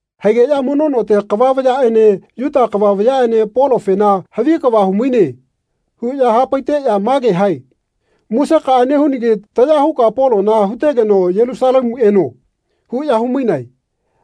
Haigeꞌya mono note kava vayaꞌene Yuta kava vayaꞌene Polofena “Havi kava humaine.” huꞌya hapaiteꞌya mage hae “Musekaꞌa nehunagi taya huka Polona hutegeno Yelusalemu eno.” huꞌya humainae.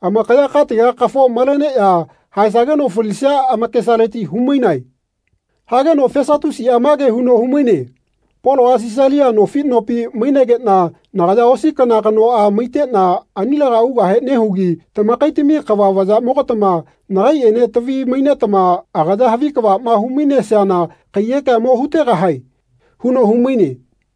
Amakaya katega kafo maleneꞌya haesageno falisia amakesaleti humainae. Hageno Fesatusiꞌa mage huno humaine “Poloꞌa Sisalia nofi nopi mainegeꞌna nagaya osi kana kanoꞌa maiteꞌna anilega ugahe nehugi tamakaitami kava vayaꞌmogatama nagaiꞌene tavi-mainetama agaya havi kavaꞌma humainesiana kaiyekea mo hutegahae.” huno humaine.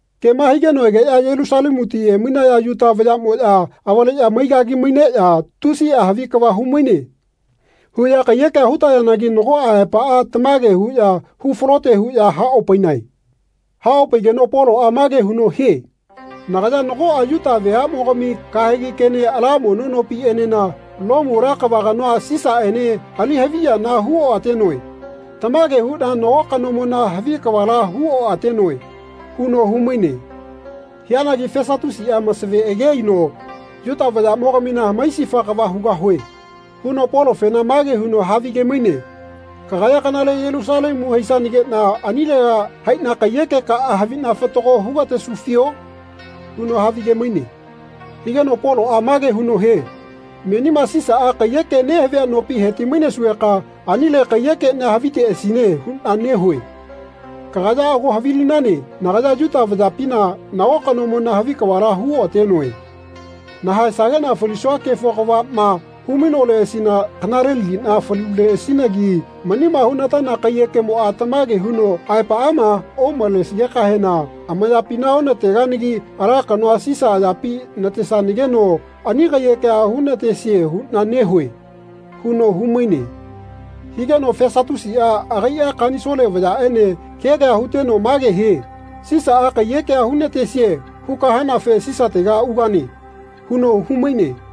Kema higeno egeꞌya Yelusalemuti emainaya Yuta vayaꞌmoꞌya avaꞌale maigagi maineꞌya “Tusiꞌa havi kava humaine.” huꞌya kaiyekea hutayanagi nagoꞌa aepaꞌa tamage huꞌya hu falote huꞌya haopainae. Haopaigeno Poloꞌa mage huno hie “Nagaya nagoꞌa Yuta veaꞌmogami kahegi kene ala mono nopiꞌenena Lomu ala kava kanoa Sisaꞌene ali-haviyana huoꞌatenoe. Tamage huꞌna nago kanomona havi kavala huoꞌatenoe.” huno humaine. Hianagi Fesatusiꞌa masave age aino “Yuta vayaꞌmogamina hamaisifa kava hugahue.” huno Polofena mage huno havige-maine “Kagaya kanale Yelusalemu haisanageꞌna anilega haiꞌna kaiyekekaꞌa haviꞌna fatago hugatesufio?” huno havige-maine. Higeno Poloꞌa mage huno hie “Menima Sisaꞌa kaiyeke nehavia nopi heti-mainesugeka anile kaiyekeꞌnia haviteꞌasine huꞌna nehue. Kagaya ago havilinane nagaya Yuta vayapina nago kanomona havi kavala huoꞌatenoe. Nahaesageꞌna falisua kefo kavaꞌma humainoleꞌasina kanalelagiꞌna faluleꞌasinagi manima hunataya kaiyekemoꞌa tamage huno aepaꞌama omalesigekahena amayapina onateganagi ala kanoa Sisa ayapi natesanageno ani kaiyekea hunatesie huꞌna nehue.” huno humaine. Higeno Fesatusiꞌa agaiꞌa Kanisole vayaꞌene kea kea huteno mage hie “Sisaꞌa kaiyekea hunatesie huka hanafe Sisatega ugane.” huno humaine.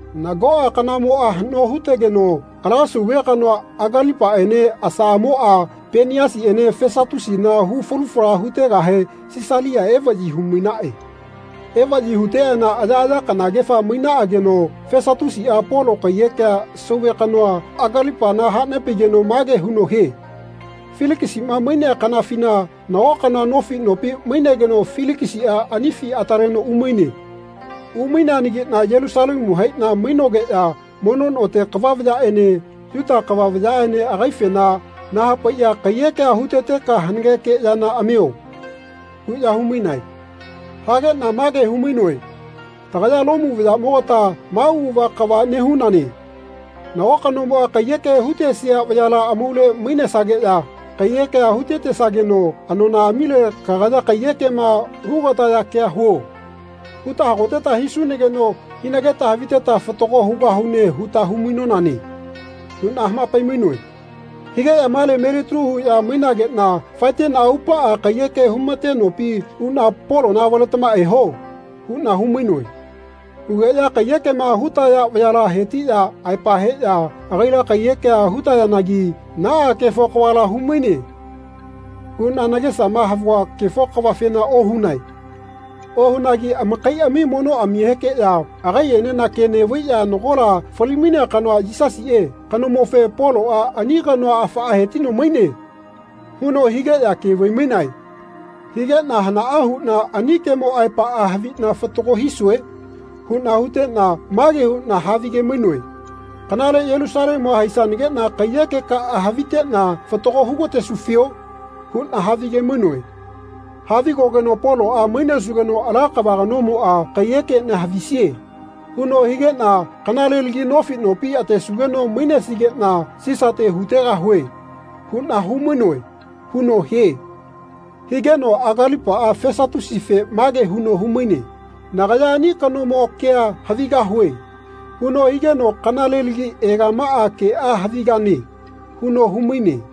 Nagoꞌa kanamoꞌa haꞌno hutegeno ala sauve kanoa Agalipaꞌene asaꞌamoꞌa Peniasiꞌene Fesatusina hu falu fala hutegahe Sisalia evaꞌyi humainaꞌe. Evaꞌyi huteꞌana ayaꞌaya kanagefa mainaꞌageno Fesatusiꞌa Polo kaiyekea sauve kanoa Agalipana hanepaino mage huno hie “Filikisiꞌma mainea kanafina nago kanoa nofi nopi mainegeno Filikisiꞌa anifi ataleno umaine. Umaineanagiꞌna Yelusalemu haiꞌna mainogeꞌya mono note kava vayaꞌene Yuta kava vayaꞌene agaifena nahapaiꞌya ‘Kaiyekea huteteka hanageke yana amio.’ huꞌya humainae. Hageꞌna mage humainoe ‘Tagaya Lomu vayaꞌmogata ma auꞌava kava nehunane. Nago kanomoꞌa kaiyeke hutesia vayala amaule mainesageꞌya kaiyekea hutetesageno anonaꞌamile ‘Kagaya kaiyekema hugataya kea huo.’ huta hagoteta hisunageno hinageta haviteta fatago hugahune huta humainonane.’ huꞌna hamapai-mainoe. Hugeꞌya male melitalu huꞌya mainageꞌna faeteꞌna aupaꞌa kaiyeke humate nopi uꞌna ‘Polona avaletama eho.’ huꞌna humainoe. Hugeꞌya kaiyekema hutaya vayala hetiꞌya aepa heꞌya agaila kaiyekea hutayanagi ‘Naꞌa kefo kavala humaine.’ huꞌna nagesama havua kefo kavafena ohunae. Ohunagi amakaiꞌami monoꞌamihekeꞌya agaiꞌenena ke neꞌvaiꞌya nagola fali-mainea kanoa, Yisasiꞌe, kanomofe, Poloꞌa ‘Ani kanoa afaꞌa hetino maine.’ huno higeꞌya ke vai-mainae. Higeꞌna ‘Hanaꞌa huꞌna ani kemo aepaꞌa haviꞌna fatago hisue?’ huꞌna huteꞌna mage huꞌna havige-mainoe ‘Kanale Yelusalemua haisanageꞌna kaiyekekaꞌa haviteꞌna fatago hugatesufio?’ huꞌna havige-mainoe. Havigogeno Poloꞌa ‘Mainesugeno ala kava kanomoꞌa kaiyekeꞌnia havisie.’ huno higeꞌna ‘Kanalelagi nofi nopi atesugeno mainesigeꞌna Sisate hutegahue.’ huꞌna humainoe.” huno hie. Higeno Agalipaꞌa Fesatusife mage huno humaine “Nagaya ani kanomo kea havigahue.” huno higeno “Kanalelagi egamaga keꞌa havigane.” huno humaine.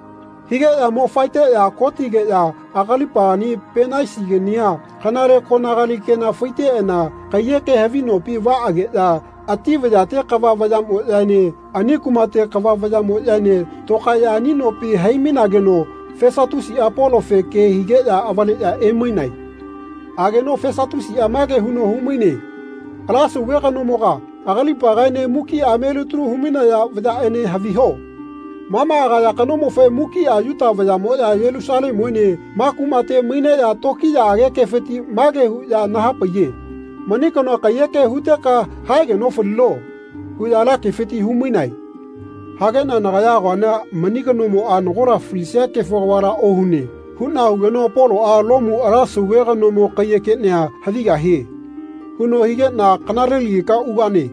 Higeꞌya mo faeteꞌya kotigeꞌya Agalipagani Penaisigania kanale konagali kena faiteꞌana kaiyeke havi nopi vaꞌageꞌya ati vayate kava vayaꞌmoꞌyaene ani kumate kava vayaꞌmoꞌyaene tokaeꞌya ani nopi hai-mainageno Fesatusiꞌa Polofe ke higeꞌya avaleꞌya emainae. Ageno Fesatusiꞌa mage huno humaine “Ala Sauve kanomoga, Agalipagaene mukiꞌa melitalu humainaya vayaꞌene haviho. Ma ma agaya kanomofe mukiꞌa Yuta vayaꞌmoꞌya Yelusalemuene ma kumateꞌene maineꞌya tokiyaꞌage kefiti mage huꞌya nahapaiye ‘Mani kanoa kaiyeke huteka haegeno falino.’ huꞌya ala kefiti humainae. Hageꞌna nagayama agoana mani kanomoꞌa nagola falisia kefo kavala ohune huꞌna hugeno Poloꞌa ‘Lomu ala Sauve kanomo kaiyekeꞌnia havigahie.’ huno higeꞌna ‘Kanalelagika ugane.’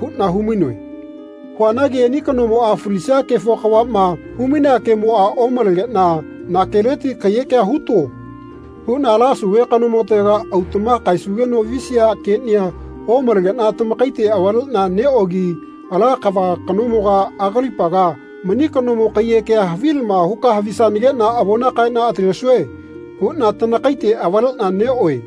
huꞌna humainoe. Huanagi ani kanomoꞌa falisia kefo kavaꞌma humainea kemoꞌa omalegeꞌna ‘Na keleti kaiyekea huto.’ huꞌna ala Sauve kanomotega autaꞌma kaesugeno visia keꞌnia omalegeꞌna tamakaite avaleꞌna neꞌogi ala kava kanomoga Agalipaga mani kanomo kaiyekea havilama huka havisanageꞌna avona kaeꞌna atalesue huꞌna tanakaite avaleꞌna neꞌoe.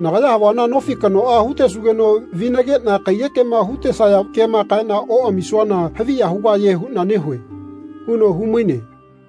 Nagaya havuana nofi kanoa hutesugeno vinageꞌna kaiyekema hutesaya kema kaeꞌna oꞌamisuana haviya hugahie huꞌna nehue.” huno humaine.